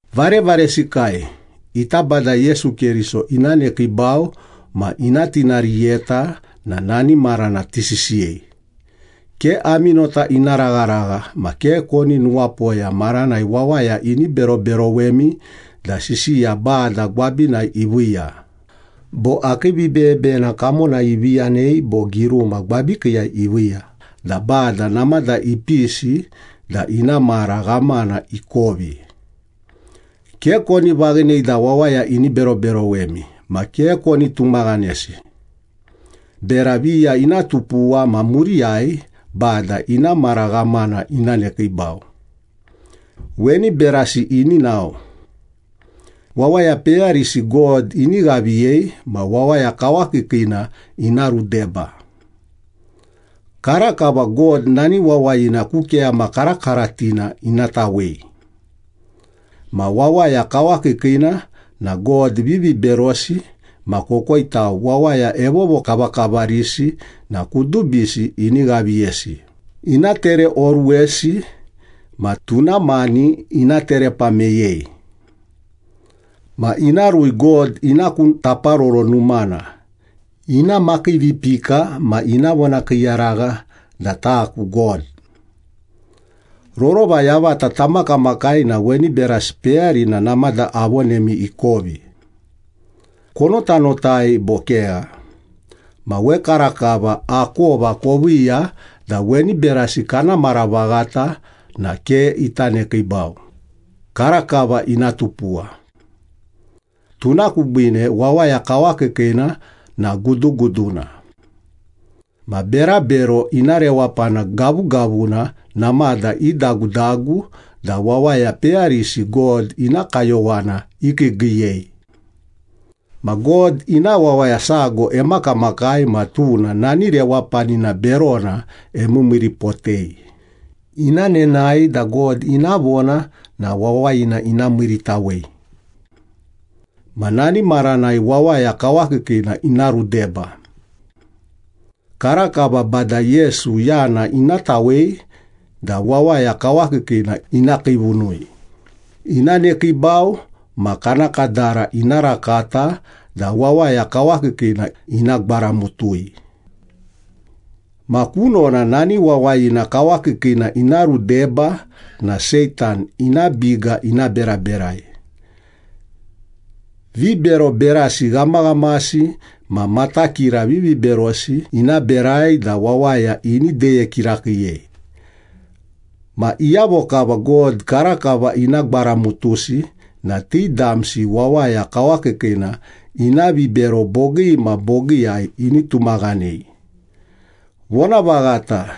Varevaresikai, ita Bada Yesu Keriso ina nekiibau ma ina tinariyeta na nani marana tisisiyei. Ke ami nota ina ragharagha ma ke koni nuwapoya maranai wawaya ini beroberowemi da sisiya Bada gwabinai iviiya, bo akii vibeyebeyena kamonai ivi yanei bo giruma gwabikiiyai iviiya da Bada namada ipisi da ina mara ghamana ikovi. Ke koni vaghinei da wawaya ini beroberowemi ma ke koni tumaghanesi. Bera viya ina tupuwa ma muriyai Bada ina mara ghamana ina nekiibau. Weni berasi ini nao. Wawaya peyarisi God ini ghaviyei ma Wawaya Kawakiikiina ina rudeba. Karakava God nani wawayina ku keyama karakaratina ina tawei. Ma Wawaya Kawakiikiina na god viviberosi ma kokoitau wawaya evovokavakavarisi na kudubisi ini ghaviyesi, ina tereoruwesi ma tuna mani ina terepa meyei. Ma ina rui God ina ku Taparoro Numana, ina makiivipika ma ina vonakiiyaragha da ‘Taku God.’ Rorova yavata tamakamakai na weni berasi peyarina namada avonemi ikovi. Konotanotai bo kegha? Ma wekarakava akova koviiya da weni berasi kana mara vaghata na ke ita nekiibau, karakava ina tupuwa. Tuna kubiine Wawaya Kawakiikiina na guduguduna. Ma berabero ina rewapana gavugavuna namada idagudagu da wawaya peyarisi God ina kayowana ikiigiiyei. Ma God ina wawaya sago emakamakai ma tuna nani rewapanina berona emiimiiripotei, ina nenae da God ina vona na wawayina ina miiritawei. Ma nani maranai Wawaya Kawakiikiina ina rudeba. Karakava Bada Yesu yana ina tawei da Wawaya Kawakiikiina ina kiivunui, ina nekiibau ma kana kadara ina rakata da Wawaya Kawakiikiina ina gwaramutui. Ma kunona nani Wawayina Kawakiikiina ina rudeba na Seitan ina biga ina beraberai. Vibero berasi ghamaghamasi ma matakira viviberosi ina berai da wawaya ini deye kirakiiyei. Ma iyavo kava God karakava ina gwaramutusi na ti damsi Wawaya Kawakiikiina ina vibero bogii ma bogiiyai ini tumaghanei. Vonavaghata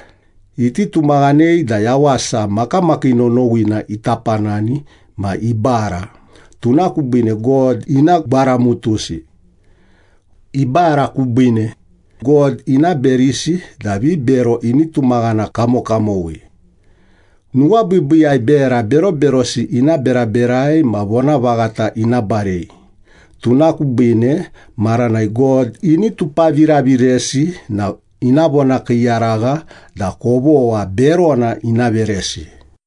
iti tumaghanei da yawasa makamakii nonowina ita panani ma ibara, tuna kubiine God ina gwaramutusi. Ibara kubiine, God ina berisi da vibero ini tumaghana kamokamowi. Nuwabiibiiyai bera beroberosi ina beraberai ma vonavaghata ina barei, tuna kubiine maranai God ini tupaviraviresi na ina vonakiiyaragha da kovogha berona ina veresi.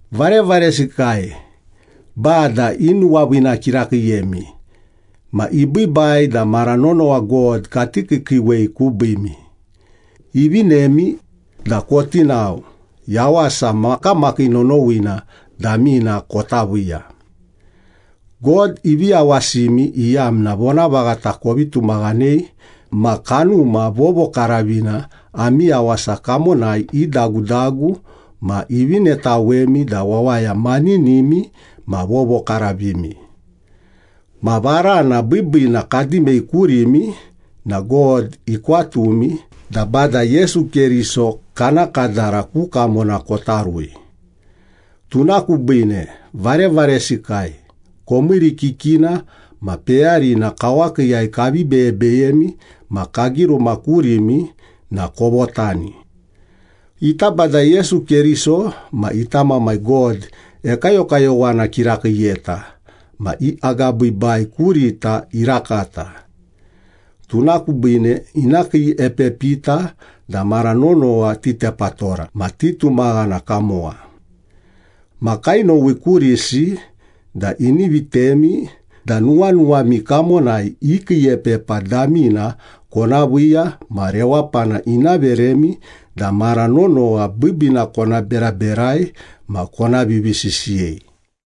Varevaresikai, Bada inuwaviina kirakiiyemi, ma ibiibai da mara nonowa God kati kiikiiwei kubiimi. Ivinemi da koti nao, yawasa makamakii nonowina damina kota viiya. God ivi yawasimi iyamna vonavaghata kovi tumaghanei ma Kanuma Vovokaravina ami yawasa kamonai idagudagu ma ivinetawemi da wawaya maninimi ma vovokaravimi. Ma varana biibiina kadimei kurimi na God ikwatumi da Bada Yesu Keriso kana kadara ku kamona kota rui. Tuna kubiine, varevaresikai, komiirikikina ma peyarina kawakiiyai kavi beybeyemi ma kagiruma kurimi na kovotani. Ita Bada Yesu Keriso ma ita Mamai God ekayokayowana kirakiiyeta ma i agabiibai kurita irakata. Tuna kubiine ina kiiepepita da mara nonowa titepatora ma titumaghana kamowa. Ma kainowi kurisi da ini vitemi da nuwanuwami kamonai i kiiepepa damina kona viiya ma rewapana ina veremi da mara nonowa biibiina kona beraberai ma kona vivisisiyei.